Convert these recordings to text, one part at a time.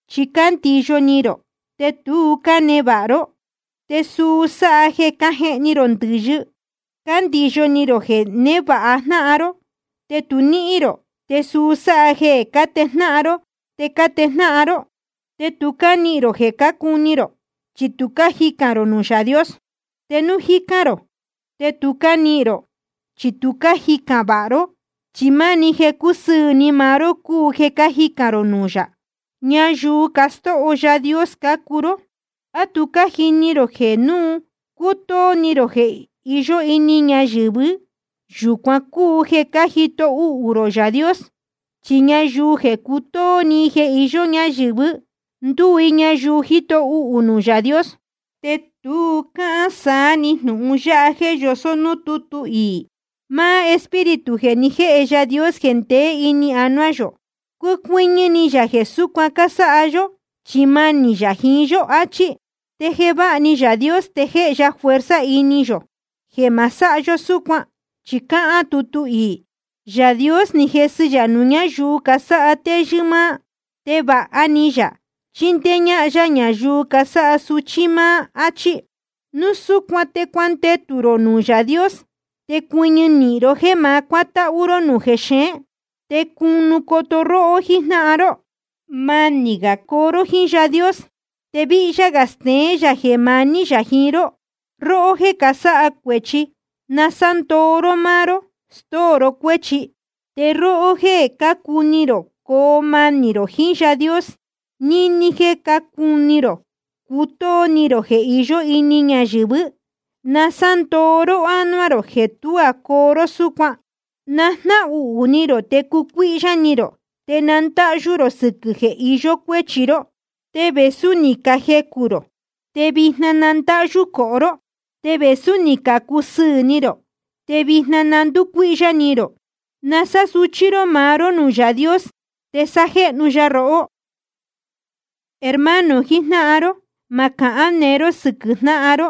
Chi cándiyo ni rō, te tu cánevāha ró, te suu sáha jeē cájehni rō ndɨ̄yɨ. Cándiyo ni rō jeē névāha jnáhan ró, te tu níhín rō, te suu sáha jeē cátejnáhan ró te cájejnáhan ró. Te tu cánihīn rō jeē cuní rō, chi tu cájicān rō nuū Yaā Dios. Te núu cájicān rō, te tu cánihīn rō, chi tu cájicān vāha ró, chi máni jeē cusɨɨ̄ ni maá ró cúu jeē cájicān rō nuū yā. Ñayuu castóo Yaā Dios cácuu ró. ¿A tu cájini rō jeē núu cútóó ni rō jeē iyó ini ñayɨ̄vɨ́, yūcuan cúu jeē cájito uhū rō Yaā Dios? Chi ñayuu jeē cutóó ni jeē iyó ñayɨ̄vɨ́, ndúu i ñayuu jíto uhū nuū Yaā Dios. Te tu cáhán saá‑ni jnūhun yáha jéē yosó núū tútu iī: Máá Espíritu jeē ni jéhe Yaā Dios jeē ndeé ini yō, cúcuɨ́ñɨ́ ni yā jeē súcuan cásáha yó, chi manī yā jiín yó, achí. Te jeē váha ni Yaā Dios, te jéhe ya fuerza ini yō jeē ma sáha yó súcuan. Chi cáhán tutu iī: Yaā Dios jésɨ yā nuū ñáyuu casáha téyɨ́ máá, te vāha ni yā chindéé ñáhán yá ñayuu casáha suchí máá, áchí. Núu súcuan te cuandetū rō nuū Yaā Dios. Te cuɨñɨ nīhin ró jéē ma cuátáhú ró jexeén, te cunu coto róhó jíjnáhan ró. Manī gā coo ró jíín Yaā Dios, te víhyá gā steén yā jeē maní yā jiín ró. Róhó jéē casáha cuēchi, na sándoo ró máá ró, stóo ró cuéchi. Te róhó jéē cácuni rō coo manī rō jiín Yaā Dios níní jéē cácuni rō cutóó ni rō jeē iyó ini ñayɨ̄vɨ́, na sándoo ró ánuá rō jeē tuá coo ró súcuan. Na jnáhuhū ni rō, te cucuíhyá ni rō, te na ndáhyú rō sɨquɨ̄ jeē iyó cuéchi ró. Te vēsú ni cajecū rō, te vijna na ndáhyú cohó ró. Te vēsú ni cacusɨɨ̄ ni rō, te vijna na ndúcuíhyá ni rō. Na sásuchí ró maá ró nuū Yaā Dios, te sájéhnu ya rohó. Hermano jijnáhan ró, ma cahán neé ró sɨquɨ̄ jnáhan ró.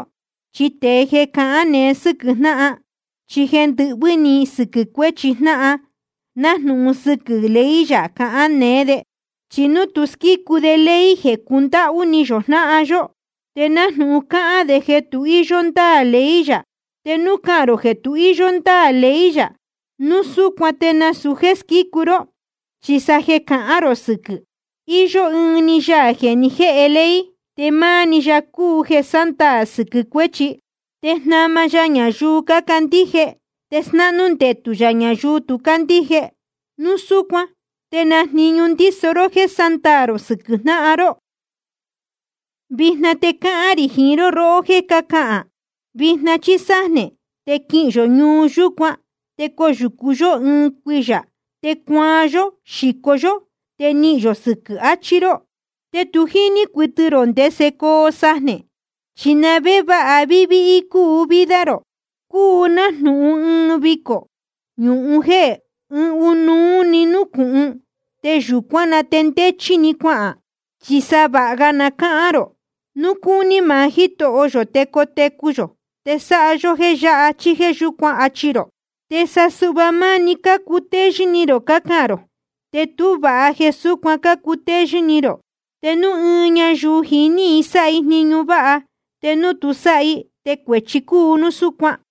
Chi tēe jeē cahán neé sɨquɨ̄ jnáhan, chí jéē ndɨhvɨ́ ni sɨquɨ̄ cuéchi jnáhan, nájnūhun jeē sɨquɨ́ ley yā cahán neé de, chi tu squícu de ley jeē cundáhú ni yō jnáhan yó, te nájnūhun cáhán de jeē tu íyó ndáā ley yā. Te núu cáhán rō jeē tu íyó ndáā ley yā, núu súcuan te nasūu jéē squícu ró, chi sa jeē cahán rō sɨquɨ̄. Iyó ɨɨn‑ni Yaā jeē ni jéhe ley, te máá‑ni ya cúu jeē sándaā sɨquɨ̄ cuéchi. Te jnama ya ñayuu cácandíje te snáhnú ndetū yā ñayuu tu cácandíje. Núu súcuan ¿te na jniñu ndíso ró jéē sándaā rō sɨquɨ̄ jnáhan ró? Vijna te cáhán rī jiín róhó jéē cácahān: Vijna chí sájnē te quihīn yō ñuu yúcuan, te coyūcu yó ɨɨn cuiyā, te cuaan yó xíco yó, te nihīn yō sɨquɨ̄, achí ró. Te tu jíní cuɨtɨ rō ndese coo sajnē. ¿Chi na vé va víhí cúu vida rō? Cúu nájnūhun ɨɨn vicō nūhún jéē ɨɨn núnúu‑ni núcūhun, te yūcuán na te ndéchí‑ni cuahān. Chi sa vāha ga na cáhán rō: Núu cúní maá Jítoho yō te cotecu yō te sáha yó jéē yáha chí jéē yúcuan, achi rō. Te sa suhva máni cácutéyɨ́ ni rō cácahān rō. Te tú vāha jeē súcuan cácutéyɨ́ ni rō. Te núu ɨɨn ñayuu jiní i sáha i jniñu váha, te núu tu sáha i, te cuēchi cúu núu súcuan.